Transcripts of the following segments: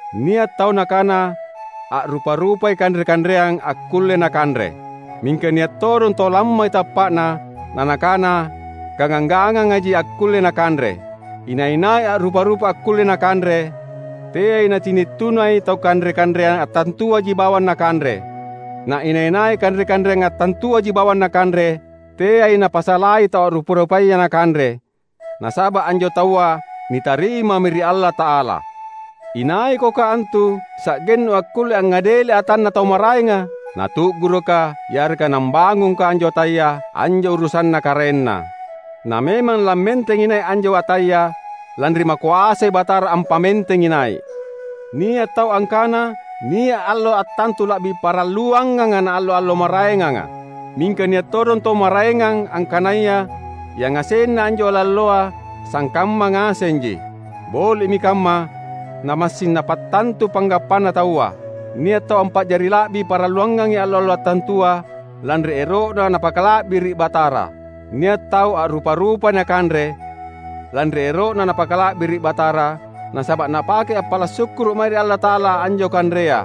Nia’ tau nakana a’rupa-rupai kanre-kanreang akkulle nakanre. Mingka nia’ todong tau lammai tappa’na nanakana gangang-ganganji akkulle nakanre. Inai-nai a’rupa-rupa akkulle nakanre, teai nacini’ tunai tau kanre-kanreang attantuaji bawang nakanre; na inai-nai kanre-kanre attantuaji bawang nakanre, teai napasalai tau a’rupa-rupaya nakanre, nasaba’ anjo taua nitarimami ri Allata’ala. Inaikoka antu sa’gennu akkulle angngadeli atanna tau maraenga? Natu’gurukka yareka nambangungka anjo ataya, anjo urusanna karaenna. Na memang lammentengi nai’ anjo ataya, lanri Makoasai Batara ampamentengi nai’. Nia’ tau angkana nia’ allo attantu la’bi paralluanganga naallo-allo maraenganga; mingka nia’ todong tau maraengang angkanaya yangasenna anjo allo-alloa sangkamma ngasenji. Boli’mi kamma, namassing napattantu panggappana taua. Nia’ tau ampa’jari la’bi paralluangangi allo-allo attantua, lanri ero’na napakala’biri’ Batara. Nia’ tau a’rupa-rupai nakanre, lanri ero’na napakala’biri’ Batara, nasaba’ napakei appala’ sukkuru’ mae ri Allata’ala anjo kanrea.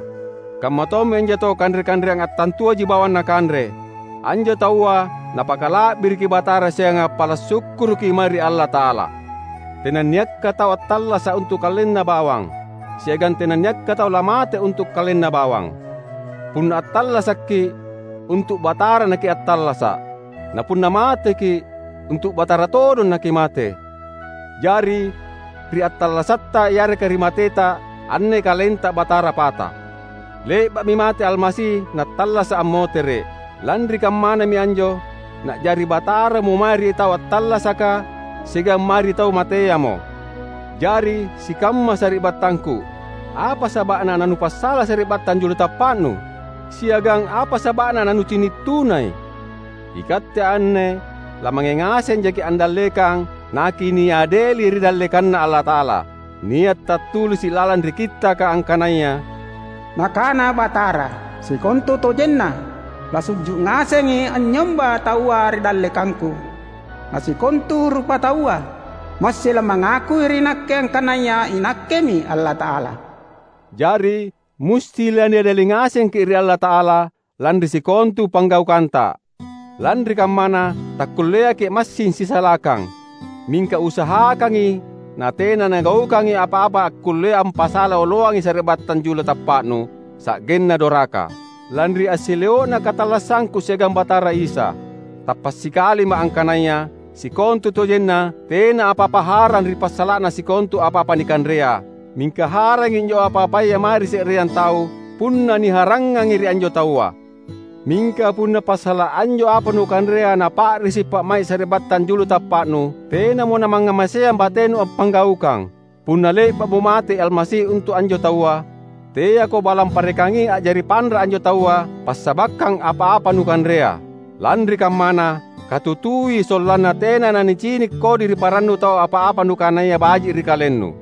Kammatommi anjo tau kanre-kanreang attantuaji bawang nakanre; anjo taua napakala’biriki Batara siagang appala’ sukkuruki mae ri Allata’ala. Tenanniakka tau attallasa’ untu’ kalenna bawang; siagang tenanniakka tau lamate untu’ kalenna bawang. Punna attallasakki’, untu’ Batara nakiattallasa’. Napunna mateki’, untu’ Batara todong nakimate. Jari, ri attallasatta yareka ri mateta, anne kalenta Batara pata. Le’ba’mi mate Almasi nattallasa’ ammotere’. Lanri kammanami anjo Na’jari Bataramo mae ri tau attallasaka siagang mae ri tau mateamo. Jari, sikamma sari’battangku! Apa saba’na nanupasala sari’battang julu tappa’nu? Siagang apa saba’na nanucini’ tunai? Ikatte anne lamange ngasenjaki’ andallekang nakiniadeli ri dallekanNa Allata’ala. Nia’ tattulisi’ lalang ri Kittaka angkanaya, "Nakana Batara, sikontutojenna, lasu’ju’ ngasengi anynyomba taua ri dallekangKu; na sikontu rupataua massing lamangakui ri Nakke angkanaya iNakkemi Allata’ala." Jari musti laniadeli ngasengki’ ri Allata’ala, lanri sikontu panggaukanta. Lanri kammana, takkulleaki’ massing sisalakang. Mingka usahakangi natena nugaukangi apa-apa akkullea ampasala oloangi sari’battang julu tappa’nu, sa’genna doraka. Lanri assileo’na katallassangku siagang Batara Isa, tappa’ sikalima’ angkanaya sikontutojenna tena apa-apa harang ri passala’na sikontu apa-apa nikanrea; mingka harangi anjo apa-apaya mae ri se’reang tau, punna niharangngangi ri anjo taua. Mingka punna passala’ anjo apa nukanrea napa’risi pa’mai’ sari’battang julu tappa’nu, tenamo namangngamaseang batenu appanggaukang. Punna le’ba’mo mate Almasi untu’ anjo taua, teako balang parekangi a’jari panra’ anjo taua passabakkang apa-apa nukanrea. Lanri kammana, katutui sollanna tena nanicini’ kodi ri parannu tau apa-apa nukanaya baji’ ri kalennu.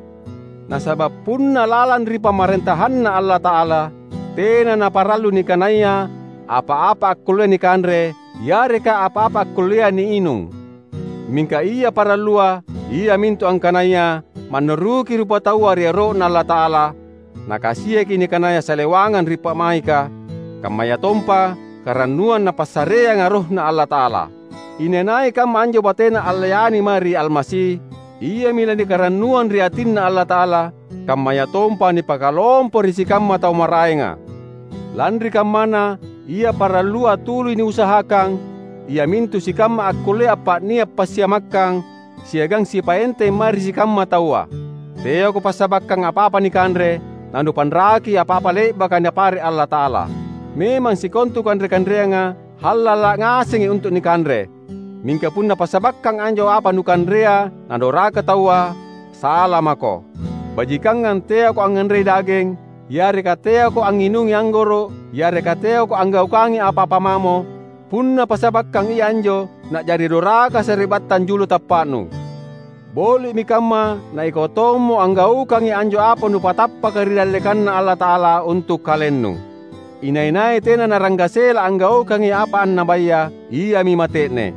Nasaba’ punna lalang ri pamarentahanNa Allata’ala, tena naparallu nikanaya apa-apa akkullea nikanre yareka apa-apa akkullea niinung. Mingka ia parallua iamintu angkanaya mannuruki rupataua ri ero’Na Allata’ala, nakasiaki nikanaya salewangang ri pa’maika, kammayatompa karannuang Napassareanga RohNa Allata’ala. Inai-nai kamma anjo batena allayani mae ri Almasi, iami lanikarannuang ri atinNa Allata’ala, kammayatompa nipakalompo ri sikamma tau maraenga. Lanri kammana, ia parallua tuli niusahakang iamintu sikamma akkullea appa’nia’ passiamakkang siagang sipaenteng mae ri sikamma taua. Teako passabakkang apa-apa nikanre, nanupanraki apa-apa le’baka Napare’ Allata’ala. Memang sikontu kanre-kanreanga hallala’ ngasengi untu’ nikanre; mingka punna passabakkang anjo apa nukanrea nadoraka taua, sala mako. Bajikangang teako angnganrei dageng yareka teako angnginungi anggoro’ yareka teako anggaukangi apa-apa mamo, punna passabakkang ia anjo na’jari doraka sari’battang julu tappa’nu. Boli’mi kamma na ikau tommo anggaukangi anjo apa nupatappaka ri dallekanNa Allata’ala untu’ kalennu. Inai-nai tena naranggasela anggaukangi apa annabaya, iami mate’ne.